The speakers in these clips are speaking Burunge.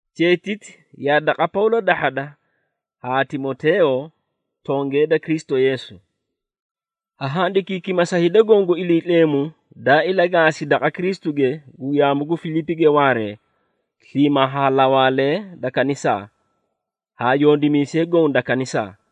Cheetiti yaa daqa Pawlo dahhada haa Timoteeyo, tongee da Kristu Yeesu. Ha handikiikima sa hida goõ gu Iliitleemu daa ilagaasi daqa Kristuge gu yaamu gu Filiipige waaree sliimaa haa lawaalee da kanisaa, haa yondimiisee goõ da kanisaa.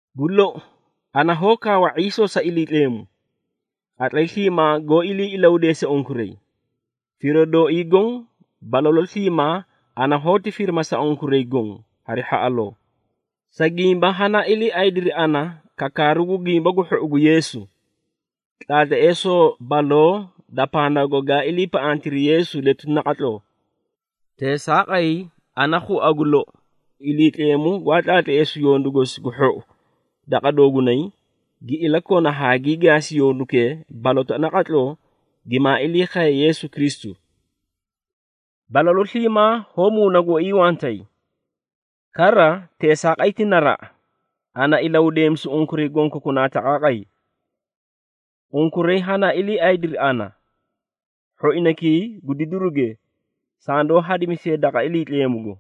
Gu lou, ana hoó kaawa ⁄iisoo sa Iliitleemu, qatlay sliimaa goó ilii ilahudeese unkuray. Firoo dooii goõ, balalu sliimaa ana hoóti firima sa unkuray goõ, hari hhaꞌaloo, sa gimba hanaa iliiaydiri ana kakaaru gu Gimba gu Hhou gu Yeesu, tlaatleesoo baloo da pandaago gaa iliipaꞌantiri Yeesu letuti naqatloo. Teesaaqay, ana khua gu lou, Iliitleemu gwaa tlaatleesu yondu gosi gu hhou daqa doogunay, gi ilakona haa gii gaasi yondukee balotaꞌa naqatloo gimaa ilii khaye Yeesu Kristu. Balalu sliimaa hoó muuna gooii wantay! Kara teesaaqay ti naraꞌa ana ilahudeemisu unkuray gonkokunaa taqaaqay. Unkuray hanaa iliiaydiri ana, hhoinaykii gu didiruge sandoó hadimisiye daqa Iliitleemugo.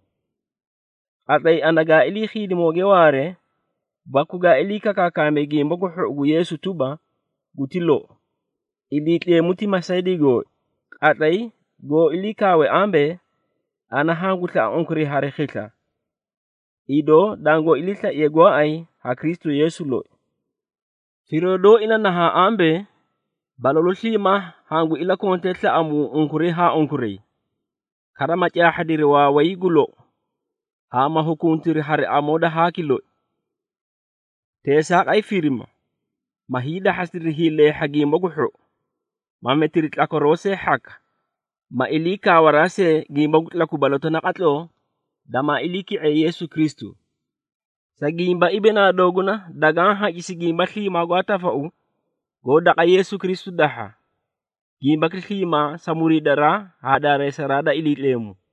Qatlay ana gaa ilii khiidimooge waaree baku gaa ilii kakaakaamee Gimba gu Hhou gu Yeesu tuba, guti lou. Iliitleemu ti masaydii gooi, qatlay goó ilii kaawe ambee, ana hangu slaꞌa unkuray hari khisla, idoo dangoó iliislaiye gooay ha Kristu Yeesu loi. Firoo dooi na nahaã ambee, balalu sliimaa hangu ilakontee slaꞌamuu unkuray haa unkuray, kara ma caahhadiri waaway gu lou, haa ma hukuntiri hari amoo da haaki loi. Teesaaqay firima, ma hiidahhasidiri hiileehha gimba gu hhou, ma metiri tlakwaroo see hhaka ma ilii kaawaraa see gimba gu tlaku balotaꞌa naqatloo damaa iliiki⁄iye Yeesu Kristu. Sa gimba, ibinaa dooguna dagaã hacisi gimba sliimaa gwaa tafau goó daqa Yeesu Kristu dahha, gimbaki sliimaa sa muriidaraa haa daareesaraa da Iliitleemu.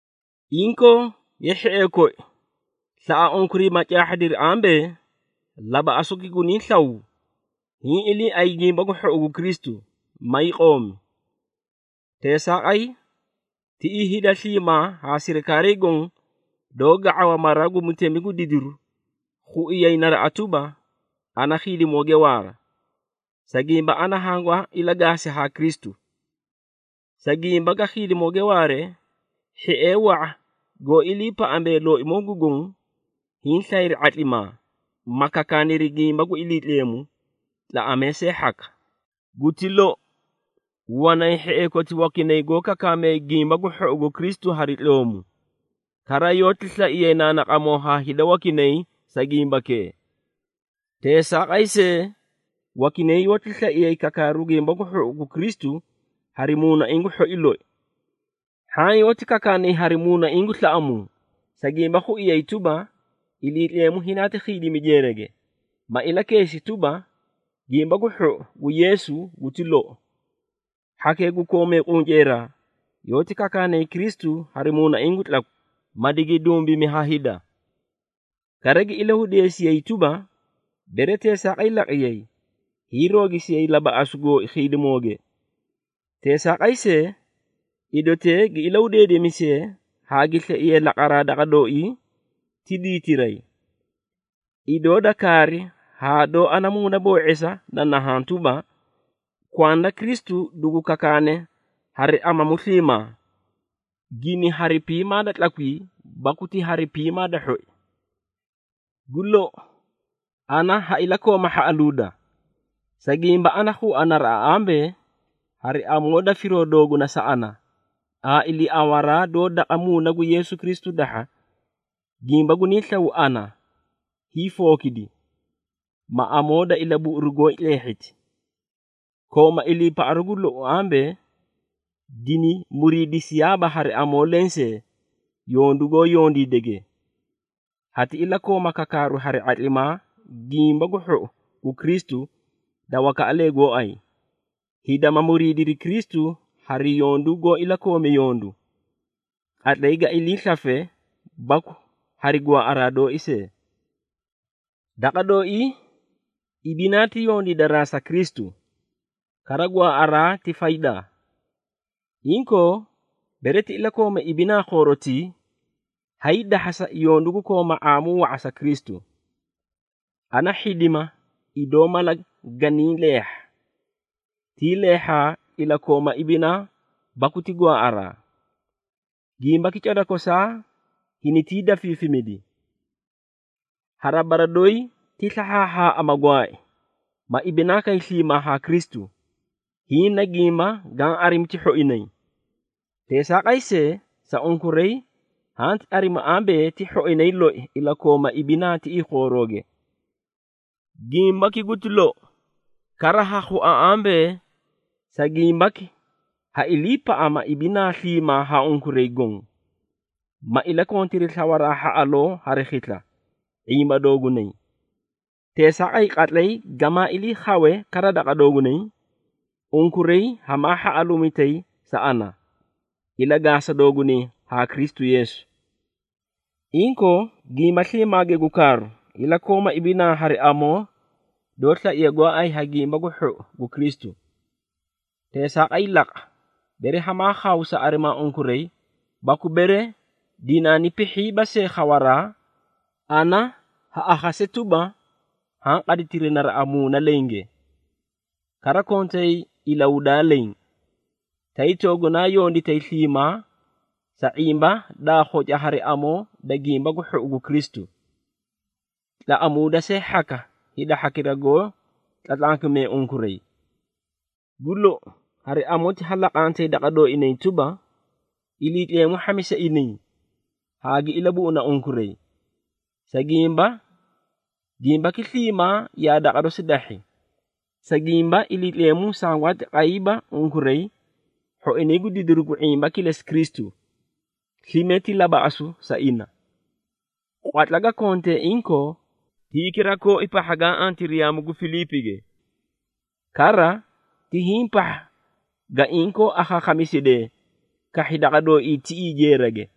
Inkoo, ye hhiee koi, slaꞌa unkuray ma caahhadiri ambee, labaꞌasuki gunaa slaw, hiĩ iliiay Gimba gu Hhou gu Kristu, maay qoomi. Teesaaqay, tiꞌii hida sliimaa haa sirikaarii goõ doó ga⁄awa mara gu mutemi gu didiru, khuiyay naraꞌa tuba, ana khiidimooge waara, sa gimba ana hangwaa ilagaasi haa Kristu. Sa gimba ga khiidimooge waare, hhiee wa⁄a goó iliipaꞌamee Looimoo gu Goõ, hiĩ slayri ⁄atlimaa, ma kakaaniri gimba gu Iliitleemu, tlaꞌamee see hhaka. Guti lou, wanay hhiee koti wakinay goó kakaamee Gimba gu Hhou gu Kristu hari tloomu, kara yoóti slaiyay naanaqamoo haa hida wakinay sa gimbakee. Teesaaqay see, wakinay yoóti slaiyay kakaaru Gimba gu Hhou gu Kristu hari muunaiĩ gu hhoi loi. Hhaã yoóti kakaanay hari muunaiĩ gu slaꞌamuu, sa gimba khuiyay tuba, dinaati khiidimi jeerage, ma ilakeesi tuba, Gimba gu Hhou gu Yeesu guti lou. Hhakee gu koomee qunceeraa, yoóti kakaanay Kristu hari muunaiĩ gu tlakwi, ma digi dumbimi ha hida. Kara gi ilahudeesiyayi tuba, bere teesaaqay laqiyay, hiirogisiyay labaꞌasu gooi khiidimooge. Teesaaqay see, idotee gi ilahudeedeemisiyee haa gi slaiyee laqaraa daqa dooii ti diitiray. Idoo da kaari haa doó ana muuna boo⁄esaa na nahaã tuba, kwanda Kristu dugu kakaakane hari amamu sliimaa, gini hari piimaa da tlakwii, baku ti hari piimaa da hhoi. Gu lou, ana ha ilakooma hhaꞌaluuda, sa gimba, ana khua naraꞌa ambee, hari amoo da firoo dooguna sa ana haa iliiawaraa doó daqa Muuna gu Yeesu Kristu dahha, gimba guniĩ slaw ana hiifookidi, ma amoo da ilabuꞌuru gooi tleehhiti. Kooma iliipaꞌaru gu lou ambee, dini muriidisiyaaba hari amoo lensee yondu goó yondiidege. Hati ilakooma kakaaru hari ⁄atlimaa Gimba gu Hhou gu Kristu da wakaꞌalee gooay, hida ma muriidiri Kristu hari yondu goó ilakoome yondu, qatlay ga ilii slafe baku hari gwaaꞌaraa dooi see. Daqa dooii, ibinaa ti yondiidaraa sa Kristu, kara gwaaꞌaraa ti faydaa. Inkoo, bere ti ilakooma ibinaa khoorotii, hayii dahhasa yondu gu kooma ⁄aamu wa⁄a sa Kristu. Ana hhidima idoo mala ganii leehha! Tii leehhaa ilakooma ibinaa baku ti gwaaꞌaraa! Gimbaki cada kosaa hinitii dafiifimidi. Hari bara doyi ti slahhaahhaaꞌa, ma gwaai, ma ibinaa kay sliimaa haa Kristu, hiĩ na gimba gaã arimi ti hhoinay. Teesaaqay see, sa unkuray hanti arimi ambee, ti hhoinay loi ilakooma ibinaa tiꞌii khoorooge. Gimbaki guti lou, kara ha khua ambee, sa gimbaki ha iliipaꞌama ibinaa sliimaa haa unkuray goõ, ma ilakontiri slawaraa hhaꞌaloo hari khisla ⁄imbaa doogunay. Teesaaqay, qatlay gamaa iliikhawe kara daqa doogunay, unkuray hamaa hhaꞌaluumitay sa ana, ilagaasa dooguna haa Kristu Yeesu. Inkoo, gimba sliimaage gu kaaru, ilakooma ibinaa hari amoo doó slaiye gooay ha Gimba gu Hhou gu Kristu. Teesaaqay laqa, bere hamaa khaw sa arimaa unkuray baku bere dinaani pihhiiba see khawaraa, ana ha akhase tuba, haã qaditiri naraꞌa muuna lenge. Kara kontay ilahudaa leẽ, tay toogunaa yonditay sliimaa sa ⁄imba daa khoca hari amoo da Gimba gu Hhou gu Kristu, tlaꞌamuuda see hhaka hida hhakira goó tlatlankimee unkuray. Gu lou, hari amoti ha laqantay daqa dooinay tuba, Iliitleemu hhamisi inay haa gi ilabuꞌuna unkuray, sa gimba, gimbaki sliimaa yaa daqa dosi dahhi. Sa gimba, Iliitleemu sangwaati qayiiba unkuray hhoinay gu didiru gu ⁄imba kilesi Kristu, slime ti labaꞌasu sa ina. Qwatla ga kontee inkoo, ti hikira kooi pahha gaa antiri yaamu gu Filiipige. Kara, ti hiĩ pahha ga inkoo akhaakhamisidee kahhi daqa dooii tiꞌii jeerage.